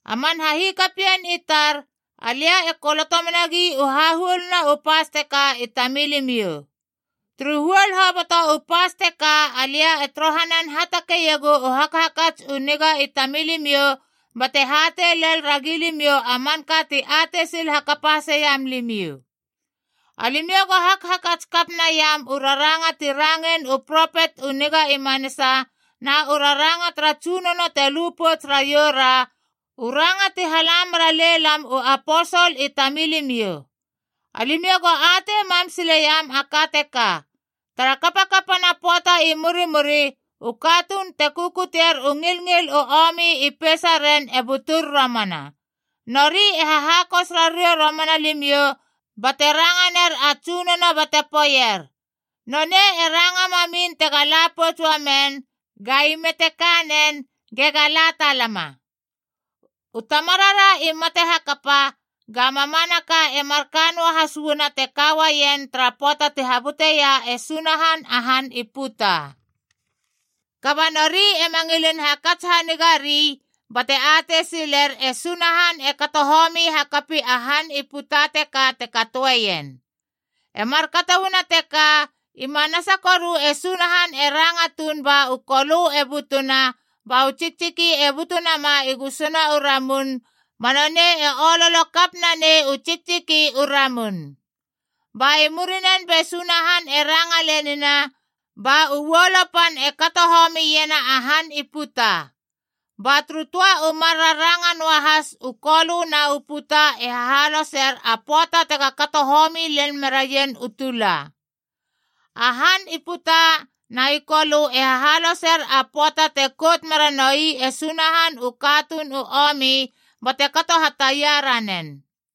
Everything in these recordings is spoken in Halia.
A man hahikapien i tar, alia e koloto menagi u hahuoluna u pas teka i tamilimiou. Turu huol hoboto u pas teka alia e torohanan hatakeiegu u hakhakats u niga i tamilimiou bate hatei lel ragi limiou a manka ti atei sil hakapa haseiam limiou. Alimiou go hakhakats kap naiam u raranga ti rangein u propet u niga i manasa, na u raranga tara Tsunono te lu pouts raiou ra, u ranga ti hala mera lelam u aposol i tamilimiou. Alimiou go atei mam sileiam a ka teka: tara kapakapana pöata i murimuri, u katuun te kukutier u ngilngil u omi i peisaren e butur romana. Nori e hahakos rariou romana limiou bate ranga ner a Tsunono bate poeier, “Nonei e ranga mamin tega la pouts uamen, ga ime te ka nen, gega la talama. U tamarara i mate hakapa, ga mamanaka e marka noahas uana te ka uaien tara pöata te habuteia e Sunahan a han i puta!” Kaba nori ema ngilin hakats hanigari bate atei siler, e Sunahan e kato homi hakapi a han i puta teka te katoeien. E markato uana teka, i manasa koru e Sunahan e ranga tuun ba u kolö e butuna ba u tsiktsiki e butu nama i gusuna u ramun ba nonei e ololo kap nanei u tsiktsiki u ramun. Ba i murinen be Sunahan e ranga lenina ba uolo pan e kato homiena a han i puta. Ba turu töa u mar raranga noahas u kolö na u puta e hahaloser a pöata tega kato homi lel meraien u tula. A han i puta na i kolö e hahaloser a pöata te kout mera noi e Sunahan u katuun u omi bate kato hataia ranen.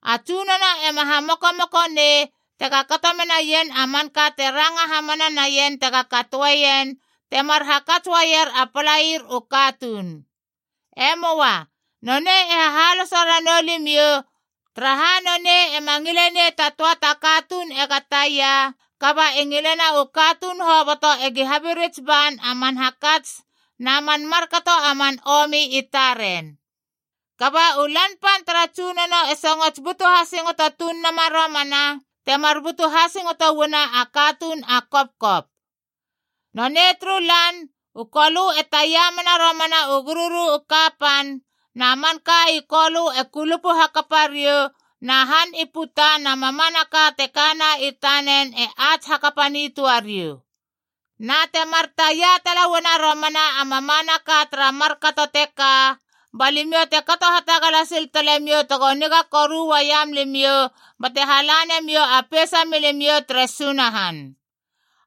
A Tsunono ema hamokomoko nei tega kato menaien a manka te ranga hamana naien tega katoeien, temar hakats uaier a palair u katuun. E möa. Nonei e hahaloso ranou limiou, taraha nonei ema ngile nei ta töa ta katuun ega taia, kaba e ngilena u katuun hoboto egi habirits ban a man hakats na man markato a man omi i taren. Kaba u Lan Pan tara Tsunono e songots butu hasingoto tuun nama romana, temar butu hasingoto uana a katuun a kopkop. Nonei turu Lan, u kolö e taia mena romana u gururu u kapan, na manka i kolö e kulupu hakapa riou, na han i puta na mamanaka te kana i tanen e ats hakapa nitöa riou. Na temar taia tala uana romana a mamanaka tara markato teka, ba limiou te kato hatagala sil talemiou tego niga koru uaiam limiou bate hala nemiou a peisa milimiou tere Sunahan.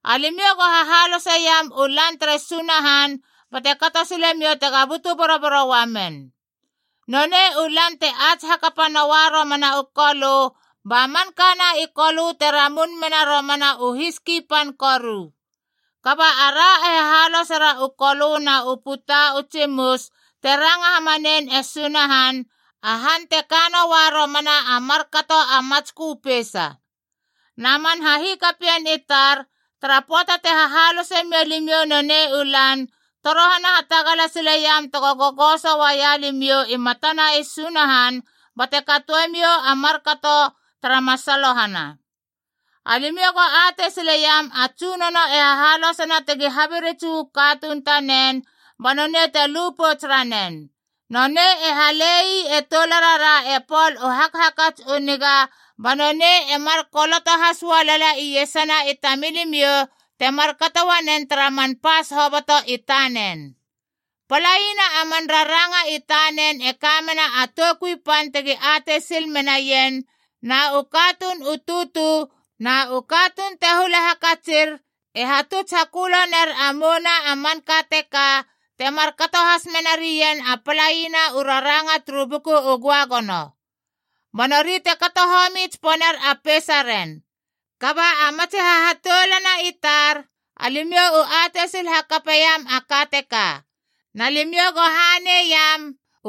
Alimiou go hahaloseiam u Lan tere Sunahan bate kato silemiou tega butu boroboro uamen. Nonei u Lan te ats hakapa noua romana u kolö, ba mankana i kolö te ramun mena romana u hiski pan koru. Kaba ara e hahalosera u kolö na u puta u tsimus te ranga hamanein e Sunahan, a han te ka noua romana a markato a matskö peisa. Na man hahikapien i tar, tara pöata te hahalose mia limiou nonei u Lan, torohana hatagala sileiam tego gogoso uaia limiou i matana e Sunahan bate katoemiou a markato tara masalohana. Alimiou go atei sileiam a Tsunono e hahalosena tegi habirits uu katuun i tanen, ba nonei te lupouts ranen. Nonei e hale ii e toularara e Pol u hakhakats u niga ba nonei e mar koloto has ualala iesana i tamilimiou, te markato uanen tara man pas hoboto i tanen. Palaina a man raranga i tanen e ka mena a toukui pan tegi atei sil menaien, na u katuun u tutu na u katuun te hula hakatsir e hatuts hakölo ner a mouna a manka teka, te markato has mena rien a palaina u raranga turu Buku u Göagono. Ba nori te kato homi tsiponer a peisaren. Kaba a matsi hahatoulana i tar, alimiou u atei sil hakapeiam a ka teka. Na limiou go haneiam,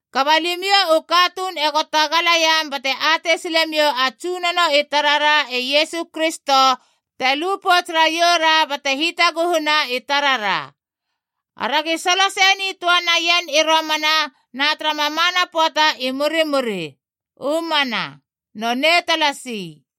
Kaba limiou u katuun ego tagalaiam bate atei silemiou a Tsunono i tarara e Iesu Kristo te lupouts raioura bate hitaguhuna i tarara. Aragi solo sei nitöa naien i romana na tara mamana pöata i murimuri. U mana. Nonei talasi.